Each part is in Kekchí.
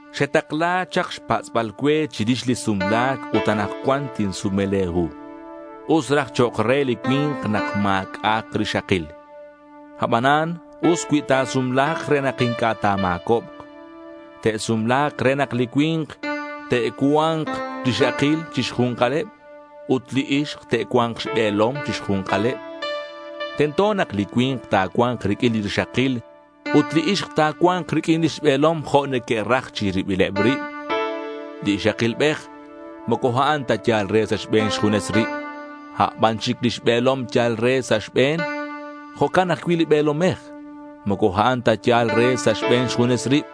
Xetakla chak xpatz'bal cue chirix li sumla̱c ut anakcuan tinsume le̱ hu. Us raj chok' re li cui̱nk nak ma̱c'a'ak rixakil. Abanan us cui ta̱sumla̱k re nak inc'a' ta̱ma̱cobk. Te'sumla̱k re nak li cui̱nk te'cua̱nk rixakil chi xju̱nkaleb ut li ixk te'cua̱nk xbe̱lom chi xju̱nkaleb. Tento nak li cui̱nk ta̱cua̱nk riq'uin li rixakil ut li ixk ta̱cua̱nk riq'uin lix be̱lom jo' neque'raj chi ribileb rib. Li ixakilbej moco a'an ta yal re sa' xbe̱n xjunes rib; aban chic lix be̱lom yal re sa' xbe̱n. Jo'can ajcui' li be̱lomej. Moco a'an ta yal re sa' xbe̱n xjunes rib;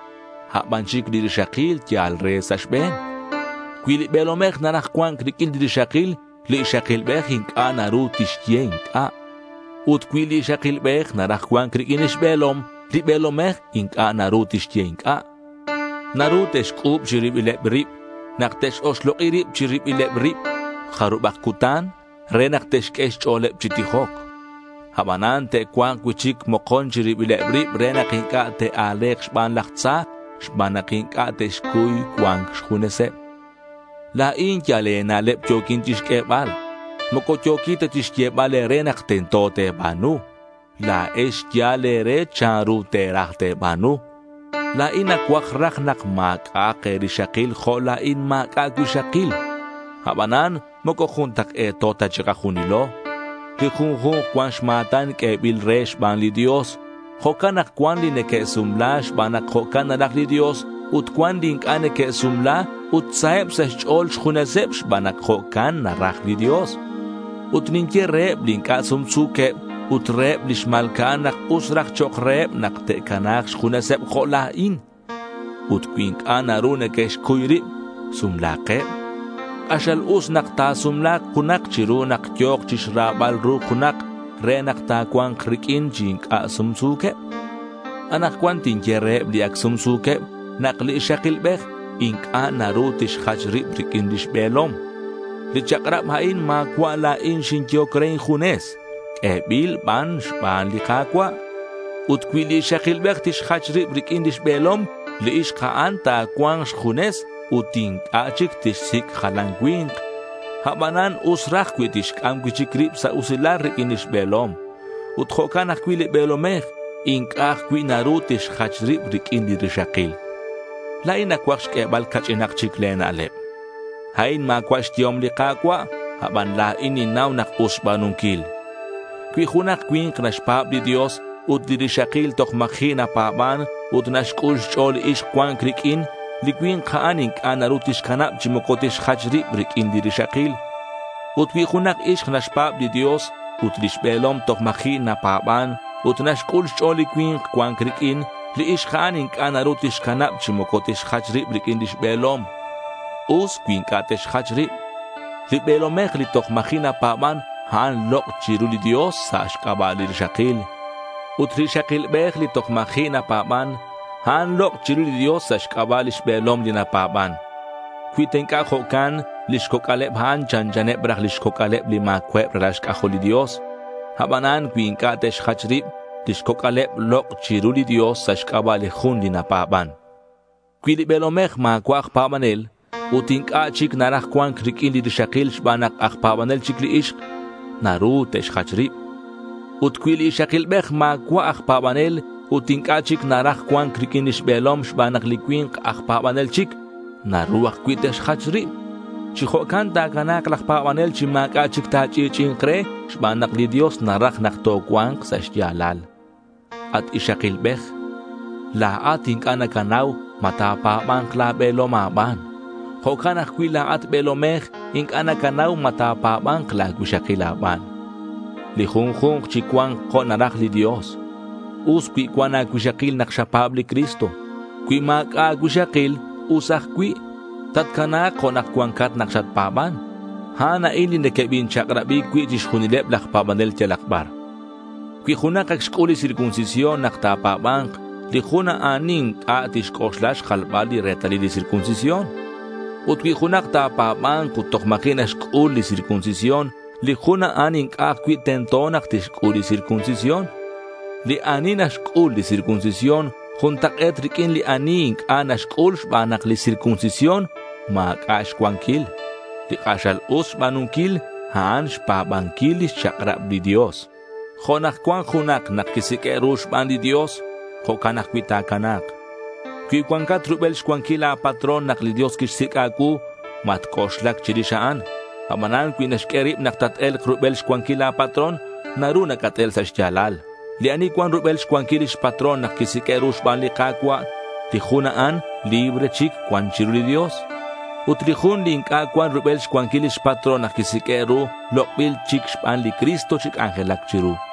a' ban chic li rixakil yal re sa' xbe̱n. Cui li be̱lomej naraj cua̱nc riq'uin li rixakil, li ixakilbej inc'a' naru tixye inc'a'. Ut cui li ixakilbej naraj cua̱nc riq'uin lix be̱lom, li be̱lomej inc'a' naru tixye inc'a'. Naru te'xc'u̱b chi ribileb rib nak te'x-oxlok'i rib chi ribileb rib jarubak cutan re nak te'xq'ue xch'o̱leb chi tijoc. Abanan te'cua̱nk cui'chic mokon chi ribileb rib re nak inc'a' te'a̱le̱k xban laj tza xban nak inc'a' te'xcuy cua̱nc xjuneseb. La̱in yal e̱na'leb yo̱quin chixq'uebal. Moco yo̱quin ta chixyebal e̱re nak tento te̱ba̱nu. La̱ex yal e̱re chanru te̱raj te̱ba̱nu. La̱in nacuaj raj nak ma̱c'a'ak e̱rixakil jo' la̱in ma̱c'a' cuixakil. Abanan moco juntak'e̱to ta chikajunilo. Li junju̱nk cuan xma̱tan q'uebil re xban li Dios. Jo'can nak cuan li neque'sumla xban nak jo'can naraj li Dios ut cuan li inc'a' neque'sumla ut saheb sa' xch'o̱l xjuneseb xban nak jo'can naraj li Dios. Ut ninye reheb li inc'a' sumsu̱queb ut reheb li xma̱lca'an nak us raj chok' reheb nak te'cana̱k xjuneseb jo' la̱in. Ut cui inc'a' naru neque'xcuy rib, sumla̱keb. K'axal us nak ta̱sumla̱k junak chiru nak yo̱k chixrabal ru junak re nak ta̱cua̱nk riq'uin chi inc'a' sumsu̱queb. Anakcuan tinye reheb li ac sumsu̱queb nak li ixakilbej inc'a' naru tixjach rib riq'uin lix be̱lom. Li chak'rab a'in ma̱cua' la̱in xinyehoc re injunes. Q'uebil ban xban li Ka̱cua'. Ut cui li ixakilbej tixjach rib riq'uin lix be̱lom, li ixk a'an ta̱cua̱nk xjunes ut inc'a' chic tixsic' jalan cui̱nk. Abanan us raj cui tixc'am cui'chic rib sa' usilal riq'uin lix be̱lom. Ut jo'can ajcui' li be̱lomej, inc'a' ajcui' naru tixjach rib riq'uin li rixakil. La̱in nacuaj xq'uebal ca'ch'inak chic le̱ na'leb. A'in ma̱cua' xyehom li Ka̱cua', aban la̱in ninnau nak us xba̱nunquil. Cui junak cui̱nk naxpa̱b li Dios ut li rixakil toj ma̱ji' napa̱ban ut naxc'ul xch'o̱l li ixk cua̱nc riq'uin, li cui̱nk a'an inc'a' naru tixcanab chi moco tixjach rib riq'uin li rixakil. Ut cui junak ixk naxpa̱b li Dios ut lix be̱lom toj ma̱ji' napa̱ban, ut naxc'ul xch'o̱l li cui̱nk cua̱nc riq'uin, li ixk a'an inc'a' naru tixcanab chi moco tixjach rib riq'uin lix be̱lom. Us cui inc'a' te'xjach rib. Li be̱lomej li toj ma̱ji' napa̱ban, a'an lok' chiru li Dios sa' xc'aba' li rixakil. Ut li ixakilbej li toj ma̱ji' napa̱ban, a'an lok' chiru li Dios sa' xc'aba' lix be̱lom li napa̱ban. Cui ta inc'a' jo'can, lix coc'al eb a'an chanchaneb raj lix coc'aleb li ma̱cua'eb ralal xc'ajol li Dios. Abanan cui inc'a' te'xjach rib, lix coc'aleb lok' chiru li Dios sa' xc'aba' li jun li napa̱ban. Cui li be̱lomej ma̱cua' aj pa̱banel ut inc'a' chic naraj cua̱nc riq'uin li rixakil xban nak aj pa̱banel chic li ixk, naru te'xjach rib. Ut cui li ixakilbej ma̱cua' aj pa̱banel ut inc'a' chic naraj cua̱nc riq'uin lix be̱lom xban nak li cui̱nk aj pa̱banel chic, naru ajcui' te'xjach rib. Chi jo'can ta̱cana̱k laj pa̱banel chi ma̱c'a' chic ta̱ch'i'ch'i'i̱nk re xban nak li Dios naraj nak tocua̱nk sa' xya̱lal. At ixakilbej, la̱at inc'a' nacanau ma ta̱pa̱ba̱nk la̱ be̱lom a̱ban. Jo'can ajcui' la̱at, be̱lomej, inc'a' nacanau ma ta̱pa̱ba̱nk la̱ cuixakil a̱ban. Li junju̱nk chicua̱nk jo' naraj li Dios. Us cui cuan a̱cuixakil nak xapa̱b li Cristo. Cui ma̱c'a' a̱cuixakil, us ajcui'. Tatcana̱k jo' nak cuancat nak xatpa̱ban. A'an a'in li nequebinchak'rabi cui' chixjunileb laj pa̱banel yalak bar. Cui junak ac xc'ul li circuncisión nak ta̱pa̱ba̱nk, li jun a'an inc'a' tixc'oxla xjalbal li retalil li circuncisión. Ut cui junak ta̱pa̱ba̱nk ut toj ma̱ji' naxc'ul li circuncisión, li jun a'an inc'a' ajcui' tento nak tixc'ul li circuncisión. Li ani naxc'ul li circuncisión juntak'e̱t riq'uin li ani inc'a' naxc'ul xban nak li circuncisión ma̱c'a' xcuanquil. Li k'axal us xba̱nunquil, a'an xpa̱banquil lix chak'rab li Dios. Jo' nak cuan junak nak quisiq'ue' ru xban li Dios, jo'can ajcui' ta̱cana̱k. Cui cuancat rubel xcuanquil la̱ patrón nak li Dios quixsic' a̱cuu, matc'oxlac chirix a'an. Abanan cui naxq'ue rib nak tat-e̱lk rubel xcuanquil la̱ patrón, naru nacat-el sa' xya̱lal. Li ani cuan rubel xcuanquil lix patrón nak quisiq'ue' ru xban li Ka̱cua', li jun a'an libre chic cuan chiru li Dios. Ut li jun li inc'a' cuan rubel xcuanquil lix patrón nak quisiq'ue' ru, lok'bil chic xban li Cristo chi c'anjelac chiru.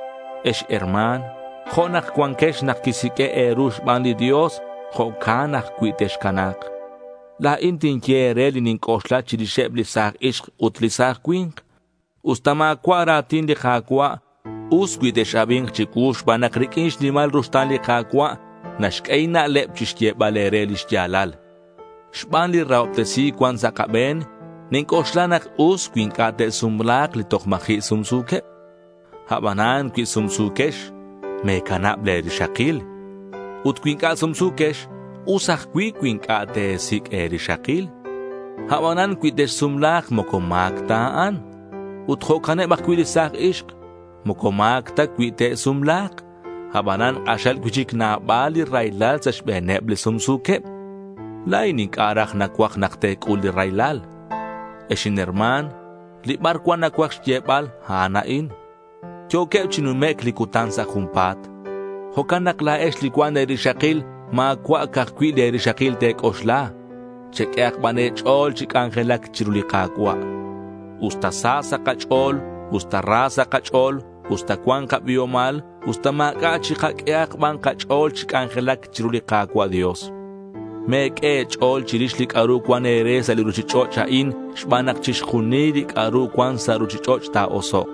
Ex herma̱n, jo' nak cuanquex nak quisiq'ue' e̱ru xban li Dios, jo'can ajcui' texcana̱k. La̱in tinye e̱re li ninc'oxla chirixeb li sa̱j ixk ut li sa̱j cui̱nk. Usta ma̱cua' ra̱tin li Ka̱cua', us cui tex-abi̱nk chicuu xban nak riq'uin xnimal ruxta̱n li Ka̱cua' naxq'ue inna'leb chixyebal e̱re lix ya̱lal. Xban li rahobtesi̱c cuan sa' kabe̱n, ninc'oxla nak us cui inc'a' te'sumla̱k li toj ma̱ji' sumsu̱queb. Abanan cui sumsu̱quex, me̱canab le̱ rixakil. Ut cui inc'a' sumsu̱quex, us ajcui' cui inc'a' te̱sic' e̱rixakil. Abanan cui texsumla̱k moco ma̱c ta a'an. Ut jo'caneb ajcui' li sa̱j ixk. Moco ma̱c ta cui te'sumla̱k. Abanan k'axal cui'chic nabal li raylal sa' xbe̱neb li sumsu̱queb. La̱in inc'a' raj nacuaj nak te̱c'ul li raylal. Ex inherma̱n, li bar cuan nacuaj xyebal, a'an a'in: Yo̱queb chi numec' li cutan sa' junpa̱t. Jo'can nak la̱ex li cuan e̱rixakil ma̱cua' ca'aj cui' le̱ rixakil te̱c'oxla. Cheq'uehak ban e̱ch'o̱l chi c'anjelac chiru li Ka̱cua'. Usta sa sa' kach'o̱l, usta ra sa' kach'o̱l, usta cuan kabiomal usta ma̱c'a', chikaq'uehak ban kach'o̱l chi c'anjelac chiru li Ka̱cua' Dios. Me̱q'ue e̱ch'o̱l chirix li c'a'ru cuan e̱re sa' li ruchich'och' a'in, xban nak chixjunil li c'a'ru cuan sa' ruchich'och' ta̱osok'.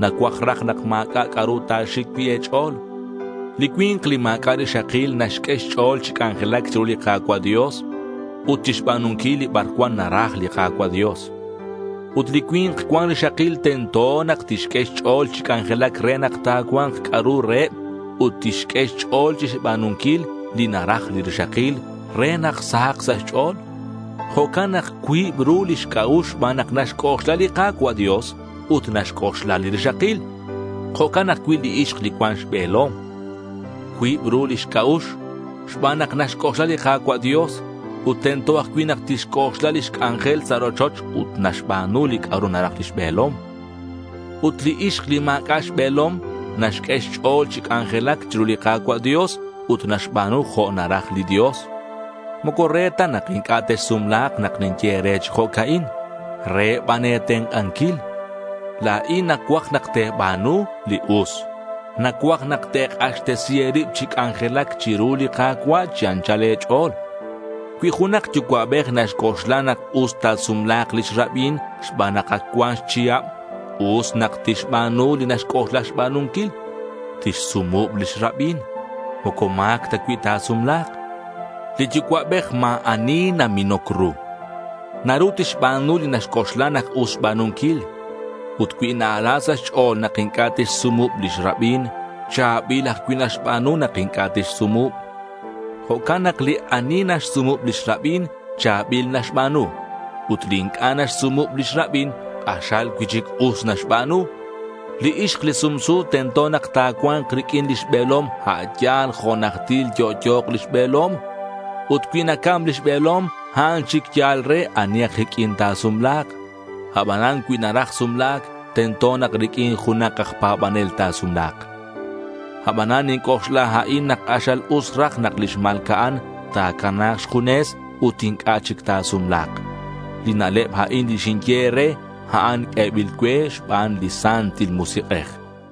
Nacuaj raj nak ma̱c'a' c'a'ru ta̱xic cui' e̱ch'o̱l. Li cui̱nk li ma̱c'a' rixakil naxq'ue xch'o̱l chi c'anjelac chiru li Ka̱cua' Dios ut chixba̱nunquil li bar cuan naraj li Ka̱cua' Dios. Ut li cui̱nk cuan rixakil tento nak tixq'ue xch'o̱l chi c'anjelac re nak ta̱cua̱nk c'a'ru reheb ut tixq'ue xch'o̱l chixba̱nunquil li naraj li rixakil re nak sahak sa' xch'o̱l. Jo'can nak cuib ru lix c'a'ux xban nak naxc'oxla li Ka̱cua' Dios ut naxc'oxla li rixakil. Jo'can ajcui' li ixk li cuan xbe̱lom. Cuib ru lix c'a'ux xban nak naxc'oxla li Ka̱cua' Dios ut tento ajcui' nak tixc'oxla lix c'anjel sa' rochoch ut naxba̱nu c'a'ru naraj lix be̱lom. Ut li ixk li ma̱c'a' xbe̱lom naxq'ue xch'o̱l chi c'anjelac chiru li Ka̱cua' Dios ut naxba̱nu jo' naraj li Dios. Moco re ta nak inc'a' texsumla̱k nak ninye e̱re chi jo'ca'in. Re ban e̱tenk'anquil. La̱in nacuaj nak te̱ba̱nu li us. Nacuaj nak te̱k'axtesi e̱rib chi c'anjelac chiru li Ka̱cua' chi anchal e̱ch'o̱l. Cui junak yucua'bej naxc'oxla nak us ta̱sumla̱k lix rabin xban nak ac cuan xchihab, us nak tixba̱nu li naxc'oxla xba̱nunquil. Tixsumub lix rabin. Moco ma̱c ta cui ta̱sumla̱k. Li yucua'bej ma̱ ani naminoc ru. Naru tixba̱nu li naxc'oxla nak us xba̱nunquil. Ut cui na-ala sa' xch'o̱l nak inc'a' tixsumub lix rabin, cha̱bil ajcui' naxba̱nu nak inc'a' tixsumub. Jo'can nak li ani naxsumub lix rabin, cha̱bil naxba̱nu. Ut li inc'a' naxsumub lix rabin, k'axal cui'chic us naxba̱nu. Li ixk li sumsu tento nak ta̱cua̱nk riq'uin lix be̱lom a' yal jo' najtil yo'yo̱k lix be̱lom. Ut cui nacam lix be̱lom a'an chic yal re ani aj iq'uin ta̱sumla̱k. Abanan cui naraj sumla̱c, tento nak riq'uin junak aj pa̱banel ta̱sumla̱k. Abanan ninc'oxla la̱in nak k'axal us raj nak li xma̱lca'an ta̱cana̱k xjunes ut inc'a' chic ta̱sumla̱k. Li na'leb a'in li xinye e̱re, a'an q'uebil cue xban li Santil Musik'ej.